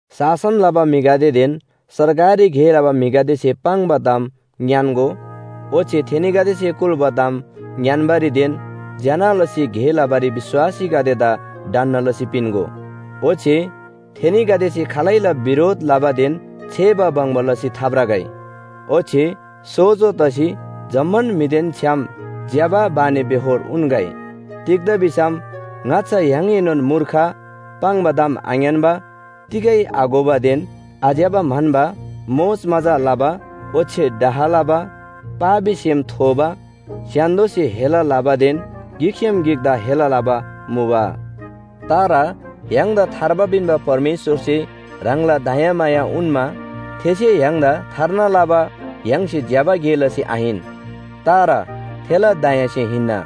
शासन लबा म्‍हिगदेदेन सरकारी गे लबा म्‍हिगदेसे पाङ्बा ताम ङ्‌यान्‍गो ओच्‍छे थेनीगदेसे कुल्‍बा ताम ङ्‌यान्‍बारीदेन ज्‍यना लसी गे लबारी विश्‍वासीगदेदा ढन्‍ना लसी पिन्‍गो। ओच्‍छे थेनीगदेसे खालैला बिरोध लबादेन छेबा बङ्बा लसी थाभ्रगै। ओच्‍छे सोजो तसी जम्‍मान म्‍हिदेन छ्‌याम ज्‍यबा बानीबेहोर उन्‍गै। तिग्‍दा भिसम ङाच्‍छा य्‍हाङएनोन मूर्ख, पाङ्बा ताम आङ्‌यान्‍बा, तिगै आघोबादेन आज्‍यबा म्‍हन्‍बा, मोजमजा लबा ओच्‍छे डाह लबा, पापी सेम थोबा, स्‍य्‍हान्‍दोसे हेला लबादेन गिकसे गिकदा हेला लबा मुबा। तर य्‍हाङदा थार्बा पिन्‍बा परमेश्‍वरसे ह्राङला दयामाया उन्‍मा, थेसे य्‍हाङदा थार्ना लबा य्‍हाङसे ज्‍यबा गे लसी आहिन, तर थेला दयासे हिन्‍ना।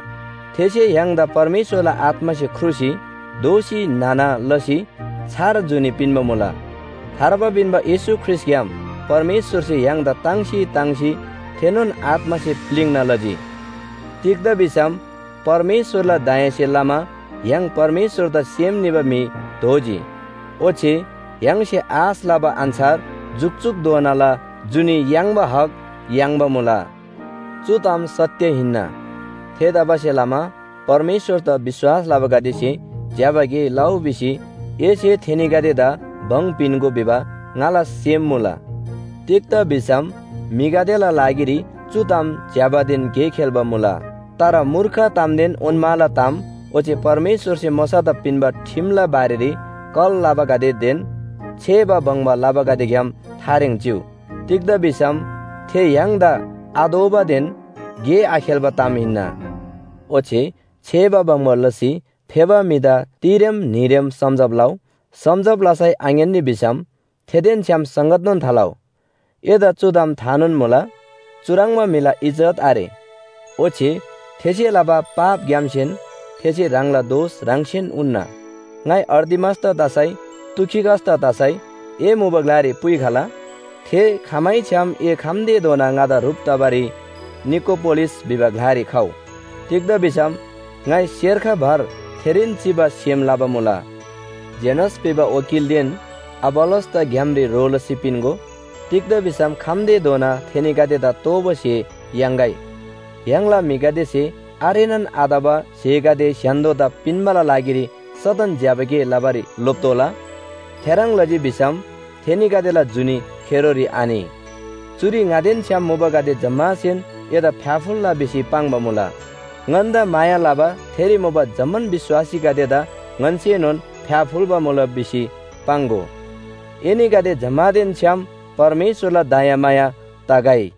थेसे य्‍हाङदा परमेश्‍वरला आत्‍मासे ख्रुसी दोःसी न्‍हना लसी छार जुनी पिन्‍बा मुला। थार्बा पिन्‍बा येशू ख्रीष्‍टग्‍याम परमेश्‍वरसे य्‍हाङदा ताङ्सी ताङ्सी थेनोन आत्‍मासे प्‍लिङ्ना लजी। तिग्‍दा भिसम परमेश्‍वरला दयासे लमा य्‍हाङ परमेश्‍वरदा सेम निबा म्‍हि दोजी। ओच्‍छे य्‍हाङसे आश लबा अन्‍छार जुकजुकधोनाला जुनी याङ्बा हक याङ्बा मुला। चु ताम सत्‍य हिन्‍ना। थेतबासेलमा परमेश्‍वरदा विश्‍वास लबागदेसे ज्‍यबा गे लउ भिसी एसे थेनीगदेदा भङ पिन्‍गो भिबा ङाला सेम मुला। तिग्‍दा भिसम म्‍हिगदेला लागिरी चु ताम ज्‍यबादेन गे खेल्‍बा मुला। तर मूर्ख तामदेन ओन्‍माला ताम ओच्‍छे परमेश्‍वरसे मोशादा पिन्‍बा ठिमला बारेरी कल लबागदेदेन छेबा बङ्बा लबागदेग्‍याम थारेङ चिउ। तिग्‍दा भिसम थे य्‍हाङदा आतोःबादेन गे आखेल्‍बा ताम हिन्‍ना। ओच्‍छे छेबा बङ्बा लसी फेबा म्‍हिदा तिरेम न्‍हीरेम सम्‍झब लउ, सम्‍झब लसै आङ्‌यान्‍नी भिसम थेदेन छ्‌याम संगतनोन थालउ। एदा चु ताम थानोन मुला, चुह्रङ्बा म्‍हिला इज्‍जत आरे। ओच्‍छे थेसे लबा पापग्‍यामसेन थेसे ह्राङला दोष ह्राङसेन उन्‍ना। ङाइ अर्तिमासदा तसै तुखिकसदा तसै ए मुबा ग्‍लारी पुइखला। थे खमैछ्‌याम ए खम्‍तेधोना ङादा ह्रुप तबारी निकोपोलिस भिबा ग्‍लारी खउ। तिग्‍दा भिसम ङाइ सेर्ख भर थेरीन चिबा सेम लबा मुला। जेनास भिबा वकीलदेन अपोल्‍लोसदा ग्‍यामरी ह्रो लसी पिन्‍गो। तिग्‍दा भिसम खम्‍तेधोना थेनीगदेदा तोःबा स्‍हे याङ्‌गै। य्‍हाङला म्‍हिगदेसे आरेनान आतबा स्‍हेगदे स्‍य्‍हान्‍दोदा पिन्‍बाला लागिरी सदन ज्‍यबा गे लबारी लोप्‍तोःला। थेह्रङ् लजी भिसम थेनीगदेला जुनी खेरोरी आनि। चुरी ङादेन छ्‌याम मुबागदे जम्‍मासेन एदा फ्‍याफुल्‍ला भिसी पाङ्बा मुला। ङन्‍दा माया लबा थेरी मुबा जम्‍मान विश्‍वासीगदेदा ङन्‍सेनोन फ्‍याफुल्‍बा मुला भिसी पाङ्‍गो। एनीगदे जम्‍मानदेन छ्‌याम परमेश्‍वरला दयामाया तगै।